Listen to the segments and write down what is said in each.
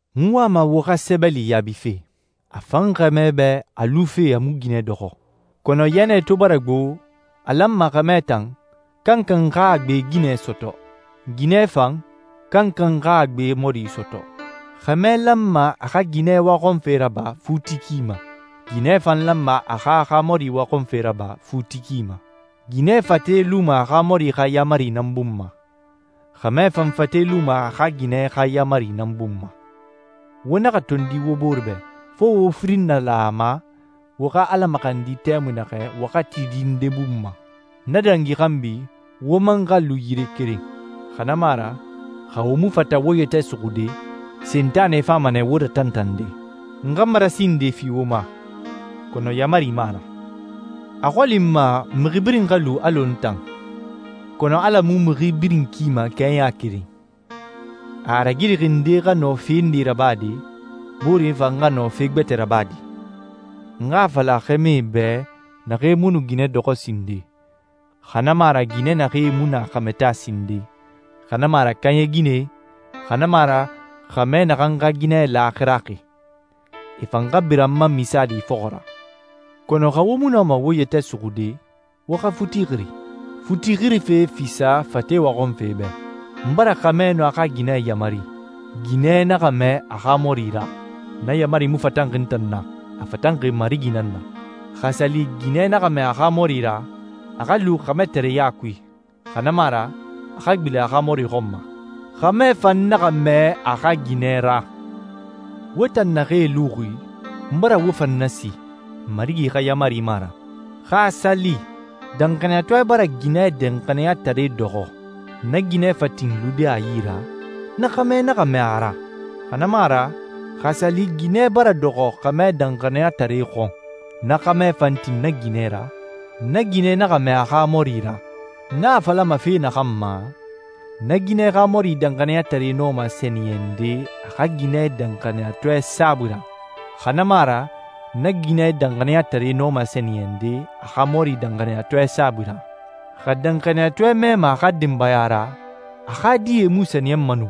N wama wo xa sɛbɛli yaabife. A fan xɛmɛ bɛ a lufe a mu ginɛ dɔxɔ, kɔnɔ yɛnɛ to bara gbo, a lanma xɛmɛ tan, kankan xa a gbe ginɛ sɔtɔ. Ginɛ fan, kankan xa a gbe mɔri sɔtɔ. Xɛmɛ lanma a xa ginɛ waxɔnfe raba futi ki ma. Ginɛ fan lanma a xa a xa mɔri waxɔnfe raba futi ki ma. Ginɛ fate luma a xa mɔri xa yaamari nan bun ma, xɛmɛ fan fate luma a xa ginɛ xa yaamari nan bun ma. Wo naxa tondi wo bore bɛ, fo wo firin nalan a ma wo xa Ala maxandi tɛmui naxɛ waxatidi nde bun ma. Na dangi xanbi, wo man xa lu yire keren, xa na mu a ra, xa wo mu fata wo yɛtɛ suxude, Sentanɛ fama nɛ wo ratantande. N xa marasi nde fi wo ma, kɔnɔ yaamari mu a ra. A xɔli n ma mixi birin xa lu alɔ n tan, kɔnɔ Ala mu mixi birin kima kɛɲa keren. A a ragirixi nde xa nɔ fe nde rabade, boore fan xa nɔ fe gbɛtɛ rabade. N xa a fala xɛmɛe bɛ, naxee mu nu ginɛ dɔxɔ sinden, xa na mu a ra ginɛ naxee mu na xɛmɛ taa sinden, xa na mu a ra kaaɲɛ ginɛe, xa na mu a ra xɛmɛ naxan xa ginɛ laaxirayaxi, e fan xa bira n ma misaali fɔxɔ ra. Kɔnɔ xa wo mu nɔma wo yɛtɛ suxude, wo xa futi xiri. Futi xirife fisa fate waxɔnfe bɛ. N bara xɛmɛ nun a xa ginɛ yamari, ginɛ naxa mɛɛ a xa mɔri ra. Na yaamari mu fatanxi n tan na, a fatanxi Marigi nan na. Xa a sa li ginɛ naxa mɛɛ a xa mɔri ra, a xa lu xɛmɛtareɲa kui, xa na mu a ra a xa gbilen a xa mɔri xɔn ma. Xɛmɛ fan naxa mɛɛ a xa ginɛ ra. Wo tan naxee luxi, n bara wo fan nasi, Marigi xa yaamari mu a ra. Xa a sa li danxaniyatɔɛ bara ginɛ danxaniyatare dɔxɔ, na ginɛ fa tin lude a yi ra, na xɛmɛ naxa mɛɛ a ra. Xa na mu a ra, xa a sa li ginɛ bara dɔxɔ xɛmɛ danxaniyatare xɔn, na xɛmɛ fa tin na ginɛ ra, na ginɛ naxa mɛɛ a xa mɔri ra. N a falama fe naxan ma, na ginɛ xa mɔri danxaniyatare nɔma sɛniyɛnde a xa ginɛ danxaniyatɔɛ saabui ra, xa na mu a ra na ginɛ danxaniyatare nɔma sɛniyɛnde a xa mɔri danxaniyatɔɛ saabui ra. Xa danxaniyatɔɛ mɛɛma a xa denbaya ra, a xa die mu sɛniyɛnma nu,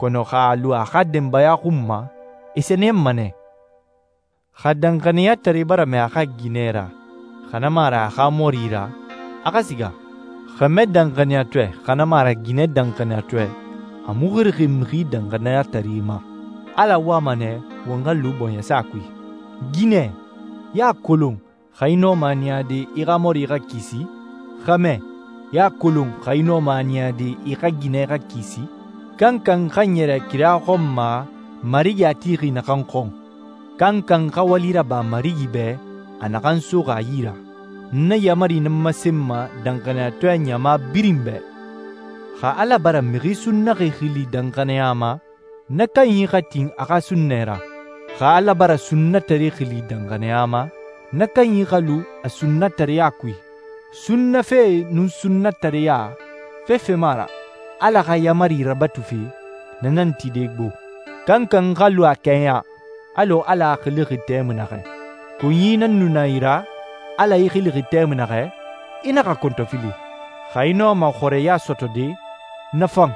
kɔnɔ xa a lu a xa denbaya xun ma, e sɛniyɛnma nɛ. Xa danxaniyatare bara mɛɛ a xa ginɛ ra, xa na mu a ra a xa mɔri ra, a xa siga. Xɛmɛ danxaniyatɔɛ, xa na mu a ra ginɛ danxaniyatɔɛ, a mu xirixi mixi danxaniyatare ma. Ala wama nɛ won xa lu bɔɲɛsa kui. Ginɛ, i a kolon xa i nɔma a niyade i xa mɔri xa kisi? Xɛmɛ, i a kolon xa i nɔma a niyade i xa ginɛ xa kisi? Kankan xa ɲɛrɛ kira xɔn ma Marigi a tixi naxan xɔn. Kankan xa wali raba Marigi bɛ a naxan soxi a yi ra. N na yaamari nan masenma danxaniyatɔɛ ɲama birin bɛ. Xa Ala bara mixi sunnaxi xili danxaniya ma, na kanyi xa tin a xa sunnɛ ra. Xa Ala bara sunnatare xili danxaniya ma, na kanyi xa lu a sunnatareya kui. Sunnafe nun sunnatareya, fefe mu a ra. Ala xa yaamari rabatufe, na nan tide gbo. Kankan xa lu a kɛɲa, alɔ Ala a xilixi tɛmui naxɛ. Konyi nan nu na i ra, Ala i xilixi tɛmui naxɛ? I naxa kɔntɔfili. Xa i nɔma xɔrɛya sɔtɔde, na fan.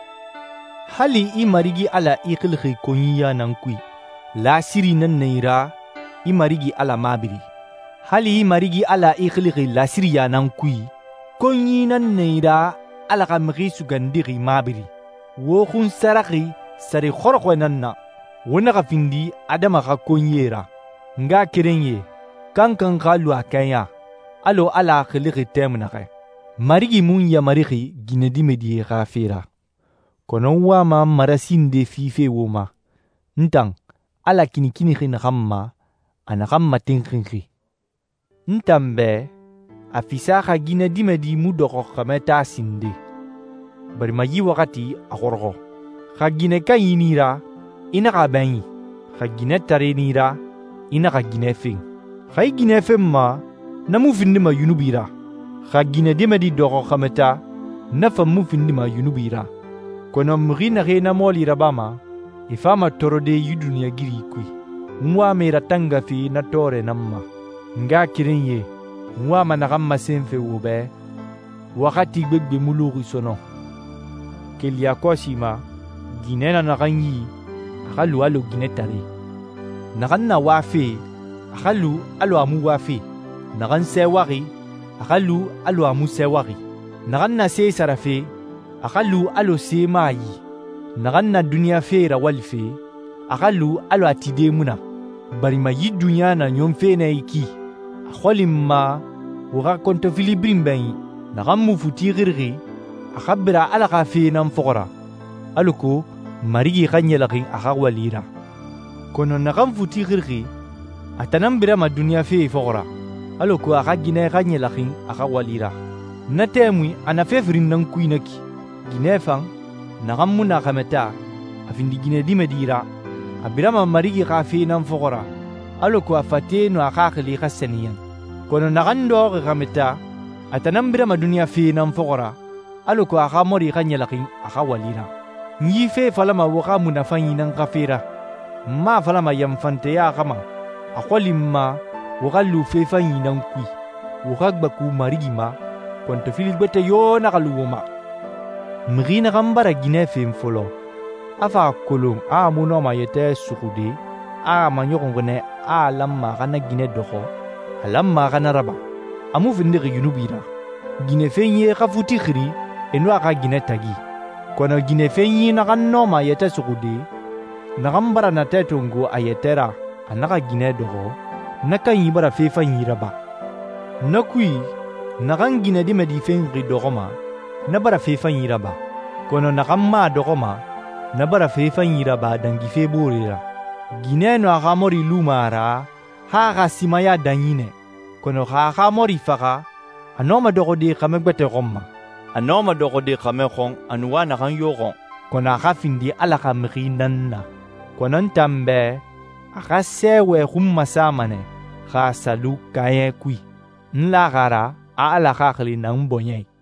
Hali i Marigi Ala i xilixi konyiya nan kui, lasiri nan i ra i Marigi Ala mabiri. Hali i Marigi Ala i xilixi lasiriya nan kui, konyi nan i ra Ala xa Mixi Sugandixi mabiri. Wo xunsaraxi sare xɔrɔxɔɛ nan na. Wo naxa findi adama xa konyie ra. N ngaxakerenyie, kankan xa lu a kɛɲa, alɔ Ala a xilixi tɛmui naxɛ. Marigi mu n yamarixi ginɛdimɛdie xa fe ra, kɔnɔ n wama marasi nde fife wo ma, n tan, Ala kinikinixi naxan ma, a naxan matinxinxi. N tan bɛ, a fisa xa ginɛdimɛdi mu dɔxɔ xɛmɛ taa sinden, barima yi waxati a xɔrɔxɔ. Xa ginɛ kanyi nan i ra, i naxa a bɛɲin. Xa ginɛtare nan i ra, i naxa ginɛ fen. Xa i ginɛ fenma, na mu findima yunubi ra. Xa ginɛdimɛdi dɔxɔ xɛmɛ taa, na fan mu findima yunubi ra. Kɔnɔ mixi naxee na mɔɔli rabama, e fama tɔɔrɔde yi duniɲɛigiri kui. N wama e ratangafe na tɔɔrɛ nan ma. N ngaxakerenyie, n wama naxan masenfe wo bɛ, waxati gbegbe mu luxi sɔnɔn. Keli yakɔsi ma, ginɛ na naxan yi, a xa lu alɔ ginɛtare. Naxan na wafe, a xa lu alɔ a mu wafe. Naxan sɛɛwaxi, a xa lu alɔ a mu sɛɛwaxi. Naxan na se sarafe, a xa lu alɔ se mu a yi. Naxan na duniɲa fe rawalife, a xa lu alɔ a tide mu na, barima yi duniɲa na ɲɔnfe nɛ yi ki. A xɔli n ma wo xa kɔntɔfili birin bɛɲin. Naxan mu futi xirixi, a xa bira Ala xa fee nan fɔxɔ ra, alako Marigi xa ɲɛlɛxin a xa wali ra. Kɔnɔ naxan futi xirixi, a tan nan birama duniɲa fee fɔxɔ ra, alako a xa ginɛ xa ɲɛlɛxin a xa wali ra. Na tɛmui a na fe firin nan kui na ki. Ginɛ fan, naxan mu na xɛmɛ taa, a findi ginɛdimɛdi ra, a birama Marigi xa fee nan fɔxɔ ra, alako a fate nun a xaxili xa sɛniyɛn. Kɔnɔ naxan dɔxɔxi xɛmɛ taa, a tan nan birama duniɲa fee nan fɔxɔ ra, alako a xa mɔri xa ɲɛlɛxin a xa wali ra. N yi fe falama wo xa munafanyi nan xa fe ra. N mu a falama yanfanteya xa ma. A xɔli n ma wo xa lu fe fanyi nan kui, wo xa gbaku Marigi ma, kɔntɔfili gbɛtɛ yo naxa lu wo ma. Mixi naxan bara ginɛ fen fɔlɔ, a fa a kolon a mu nɔma a yɛtɛ suxude, a a maɲɔxunxi nɛ a a lanma a xa na ginɛ dɔxɔ, a lanma a xa na raba. A mu findixi yunubi ra. Ginɛfenyie xa futi xiri e nun a xa ginɛ tagi. Kɔnɔ ginɛfenyi naxan nɔma a yɛtɛ suxude, naxan bara natɛ tongo a yɛtɛ ra a naxa ginɛ dɔxɔ, na kanyi bara fe fanyi raba. Na kui, naxan ginɛdimɛdi fenxi dɔxɔma, na bara fe fanyi raba, kɔnɔ naxan mu a dɔxɔma, na bara fe fanyi raba dangife boore ra. Ginɛ nun a xa mɔri luma a ra han a xa simaya danyi nɛ. Kɔnɔ xa a xa mɔri faxa, a nɔma dɔxɔde xɛmɛ gbɛtɛ xɔn ma. A nɔma dɔxɔde xɛmɛ xɔn a nu wa naxan yo xɔn, kɔnɔ a xa findi Ala xa mixi nan na. Kɔnɔ n tan bɛ, a xa sɛɛwɛ xun masama nɛ xa a sa lu kaaɲɛ kui. N laxi a ra a Ala Xaxili na n bɔɲɛ i.